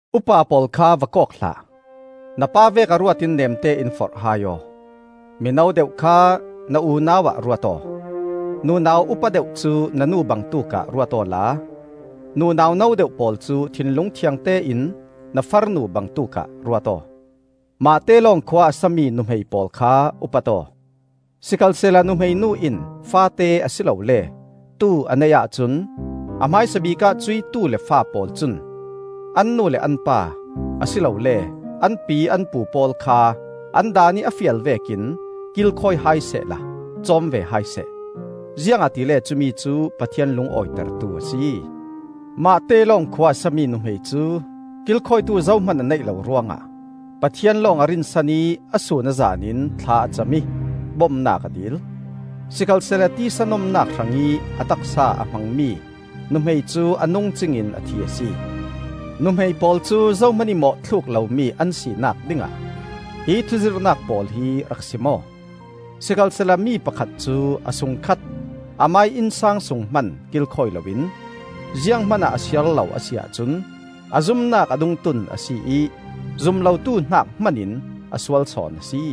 Upa pawl kha va kawk hlah; na pa vekah ruat in neemte in forh hai aw. Mino deuh kha na unau-ah ruat aw. Nunau upa deuh cu na nu bangtuk ah ruat awla, nunau no deuh pawl cu thinlung thiangte in na farnu bangtuk ah ruat aw. Mahte lawng khua a sami nuhmei pawl kha upat aw. Sikhalsehla nuhmei nu in faate a si lole tu a neih ahcun a hmaisabik ah cuih tu le fa pawl cun an nu le an pa, a si lole an pi an pu pawl kha an daanih a fial vekin kilkhawi hai sehla cawm ve hai seh. Ziangahtile cumicu Pathian lungawitertu a si. Mahte lawng khua a sami nuhmei cu, kilkhawitu zohman a neih lo ruangah, Pathian lawng a rinsan ih a sun a zanin thla a cam ih bomnak a dil. Sikhalsehla tisa nomnak hrangih a taksa a hmangmi nuhmei cu a nung cingin a thi a si. Nuhmei pawl cu zohmanih mawhthluk lomi an sinak dingah hi thuzirhnak pawl hi rak sim aw. Sikhalsehla mi pakhat cu a sungkhat, amah ih innsang sung hman kilkhawi loin zianghman ah a siar lo a si ahcun a zumnak a dungtun a si ih zum lotu hnak hmanin a sual sawn a si.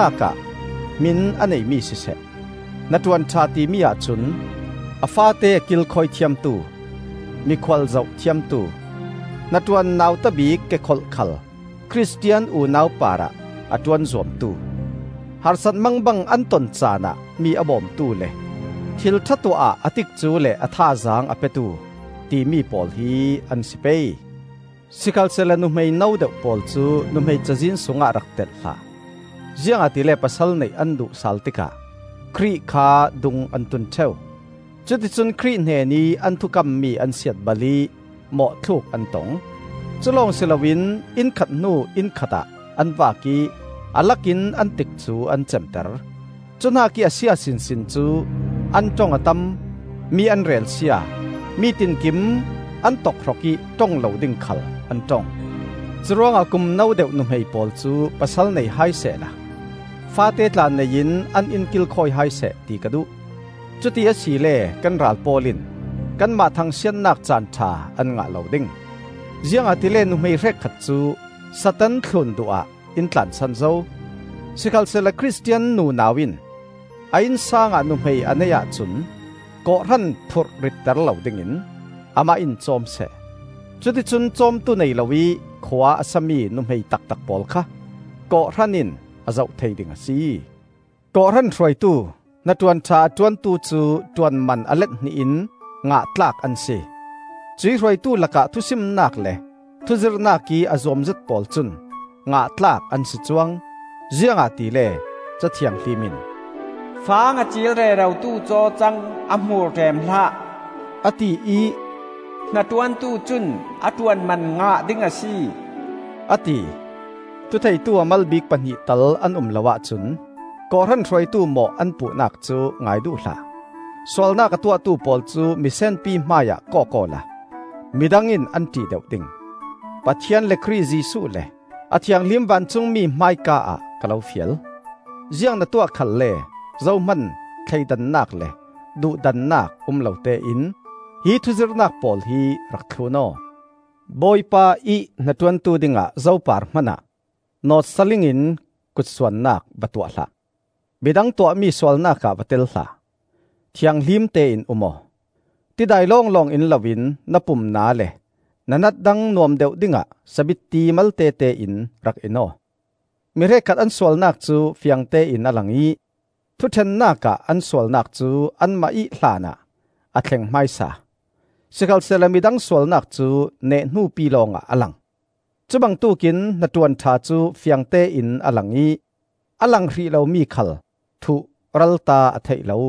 Hnaṭuan ṭhatnak ah hmin a neimi siseh. Hnaṭuan ṭha timi ahcun: a faate a kilkhawi thiamtu, mikhual zoh thiamtu, hnaṭuan nauta bik kekholh khal Khristian unau parah a ṭuan zuamtu, harsat mangbang an ton caanah mi a bawmtu, le thilṭha tuah ah a tikcu le a thazaang a petu, timi pawl hi an si pei. Sikhalsehla nuhmei no deuh pawl cu nuhmei cazin sungah rak telh hlah. Ziangahtile pasal neih an duh sal tikah Khrih kha dung an tun ṭheu. Cuticun Khrih hnenih an thukammi an siatbal ih mawhthluk an tong. Culawng si loin inn khat hnu inn khatah an vak ih a lakin an tikcu an cemter. Cu hnakih a sia sinsin cu: an ṭong a tam, mi an relsia, mi tinkim an tokhrok ih ṭong lo ding khal an ṭong. Curuangah kum no deuh nuhmei pawl cu pasal nei hai sehla faate tla nei in an inn kilkhawi hai seh ti ka duh. Cuti asile kan ral pawl in kanmah thangsiatnak caanṭha an ngah lo ding. Ziangahtile nuhmei hrekkhat cu Satan thlun duh ah in tlansan zo. Sikhalsehla Khristian nunau in a innsang ah nuhmei a neih ahcun kawhhran phurh ritter lo dingin amah in cawm seh. Cuti cun cawmtu nei loih khua a sami nuhmei taktak pawl kha kawhhran in a zoh thei ding a si. Kawhhran Hruaitu, hnaṭuan ṭha a ṭuantu cu ṭuan man a let hnih in ngah tlak an si. Cuih hruaitu lakah thusimnak le thuzirhnak ih a zuamzet pawl cun ngah tlak an si cuang. Ziangahtile Ca Thianghlim in, “Fang a ciil rerotu cawcang a hmur ṭem hlah,” a ti ih, “Hnaṭuantu cun a ṭuanman ngah ding a si,” a ti. Thutheitu a mal bik pahnih tal an um lo ahcun kawhhran hruaitu mawh an puhnak cu ngai duh hlah. Sualnak a tuahtu pawl cu misenpi hmaiah kawk awla midang in an ṭih deuh ding. Pathian le Khrih Jesuh le a thianghlim vancungmi hmaika-ah ka lo fial: ziang na tuah khalle zohman thleidannak le duhdannak um lotein hi thuzirhnak pawl hi rak thlun aw. Bawipa ih hnaṭuantu dingah zo par hmanah nawt-sa-ling in kutsuannak va tuah hlah. Midang tuahmi sualnak ah va tel hlah; thianghlim tein um aw. Tidai lawnglawng in loin na pum na le na nat dang nuam deuh dingah sabitti maltete in rak in aw. Mi hrekkhat an sualnak cu fiangtein a lang ih thuṭhennak ah an sualnak cu anmah ih hlanah a thleng hmaisa; sikhalsehla midang sualnak cu neh hnupi lawngah a lang. Cubangtuk in hnaṭuan ṭha cu fiangtein a lang ih a lang hrih lomi khal thuh-ralta a theih lo.